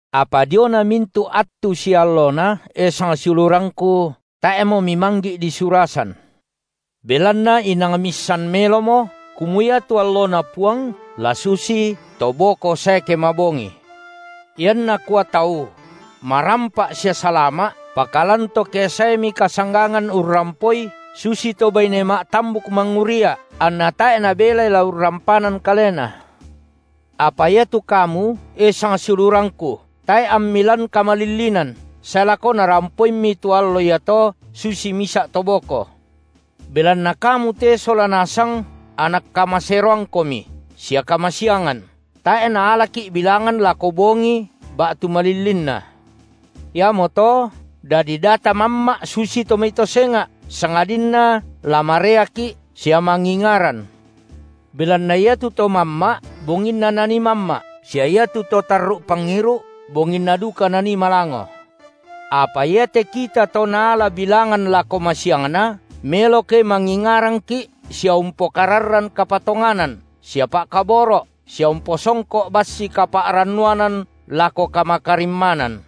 Apa diona mintu’ attu sia allona, e sangsiulurangku, tae’mo mimanggi’ disurasan. Belanna inang miissan melomo, kumua iatu alloNa Puang la susito boko sae ke mabongii. Ianna kua tau: Marampa’ sia salama’, pakalan to ke saemi kasanggangan urrampoi, susito baine ma’tambuk mangurria’; anna tae’ nabelai la urrampanan kalena. Apa iatu kamu, e sangsiulurangku, tae’ ammi lan kamalillinan, sae lako narampoimmi tu allo iato susi misa’ to boko. Belanna kamu te sola nasang anak kamaseroangkomi sia kamasiangan, tae’ naalaki’ bilangan lako bongi ba’tu malillinna. Iamoto dadi da tamamma’ susitu mai to senga’, sangadinna la mareaki’ sia mangingaran. Belanna iatu to mamma’, bonginna nanii mamma’, sia iatu to tarru’ pangiru’, bonginna duka nanii malango. Apa iate kita to naala bilangan lako masiangna, melo ke mangingarangki’ sia umpokararran kapatonganan sia pa’kaboro’ sia umposongko’ bassi kapa’rannuanan lako kamakarimmanan.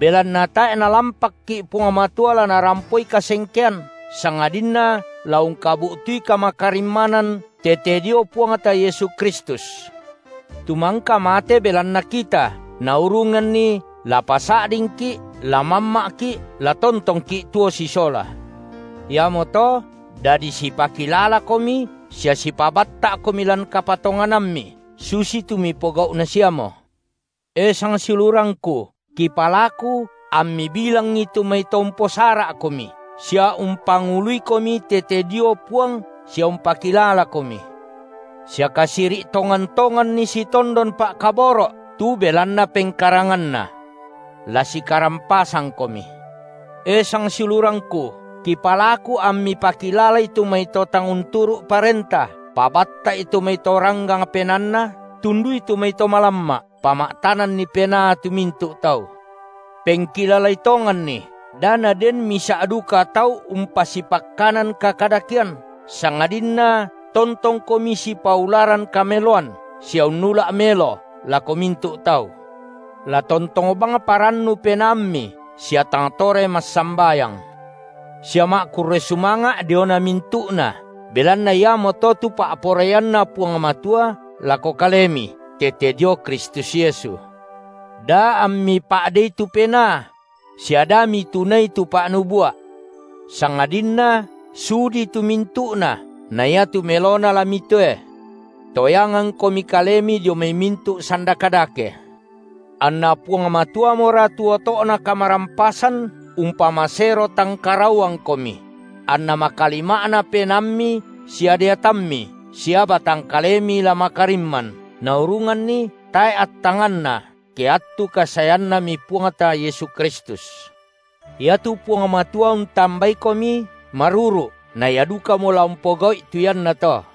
Belanna tae’ Nalampakki’ Puang Matua la narampoi kasengkean, sangadinna la ungkabu’tui kamakarimmanan tete dio Puangta Yesu Kristus. Tu mangka mate belanna kita, naurunganni la pasa’dingki’, la mamma’ki’, la tontongki’ tuo sisola. Iamoto dadi sipakilalakomi sia sipabatta’komi lan kapatonganammi, susitu mipogau’na siamo. E sangsiulurangku, kipalaku ammi bilangi tu mai to umposara’komi, sia umpanguluikomi tete dio Puang sia umpakilalakomi, sia kasiri’ tongan-tonganni sitondon pa’kaboro’ tu belanna pengkaranganna. La sikarampasangkomi. E sangsiulurangku, kipalaku ammi pakilalai tu mai to tang unturu’ parenta, pabatta’i tu mai to ranggang penaanna, tundui tu mai to malamma’, pama’tananni penaa tu mintu’ tau. Pengkilalai tonganni, da naden misa’ duka tau umpasipakkanan kakadakean, sangadinna tontongkomi sipaularan kameloan sia unnula’ melo, lako mintu’ tau. La tontong bang parannu penaammi; sia tang tore massambayang; sia ma’kurre’ sumanga’ diona mintu’na, belanna iamoto tu pa’poraianNa Puang Matua lako kalemi tete dio Kristus Yesu; Da ammi pa’dei tu Penaa; sia da mitunai tu pa’nubua’. Sangadinna sudi tu mintu’na, na iatu melona la mitoe. Toyangangkomi kalemi dio mai mintu’ sanda kadake. Anna Puang Matuamora tu oto’na kamarampasan, umpamasero tangkarauangkomi; anna makalima’na penaammi sia deatammi sia batang kalemi la makarimman, naurunganni tae’ attanganna ke attu kasaeannami Puangta Yesu Kristus. Iatu Puang Matua untambaikomi maruru’, na Ia dukamo la umpogau’i tu iannato.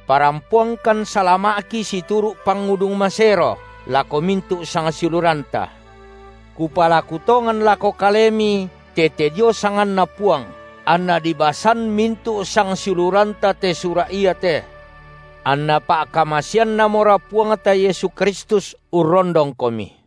Parampoangkan salama’ki situru’ pangudung masero lako mintu’ sangsiuluranta. Kupalaku tongan lako kalemi tete dio sanganNa Puang, anna dibasan mintu’ sangsiuluranta te sura’, iate. Anna pa’kamaseannamora Puangta Yesu Kristus urrondongkomi.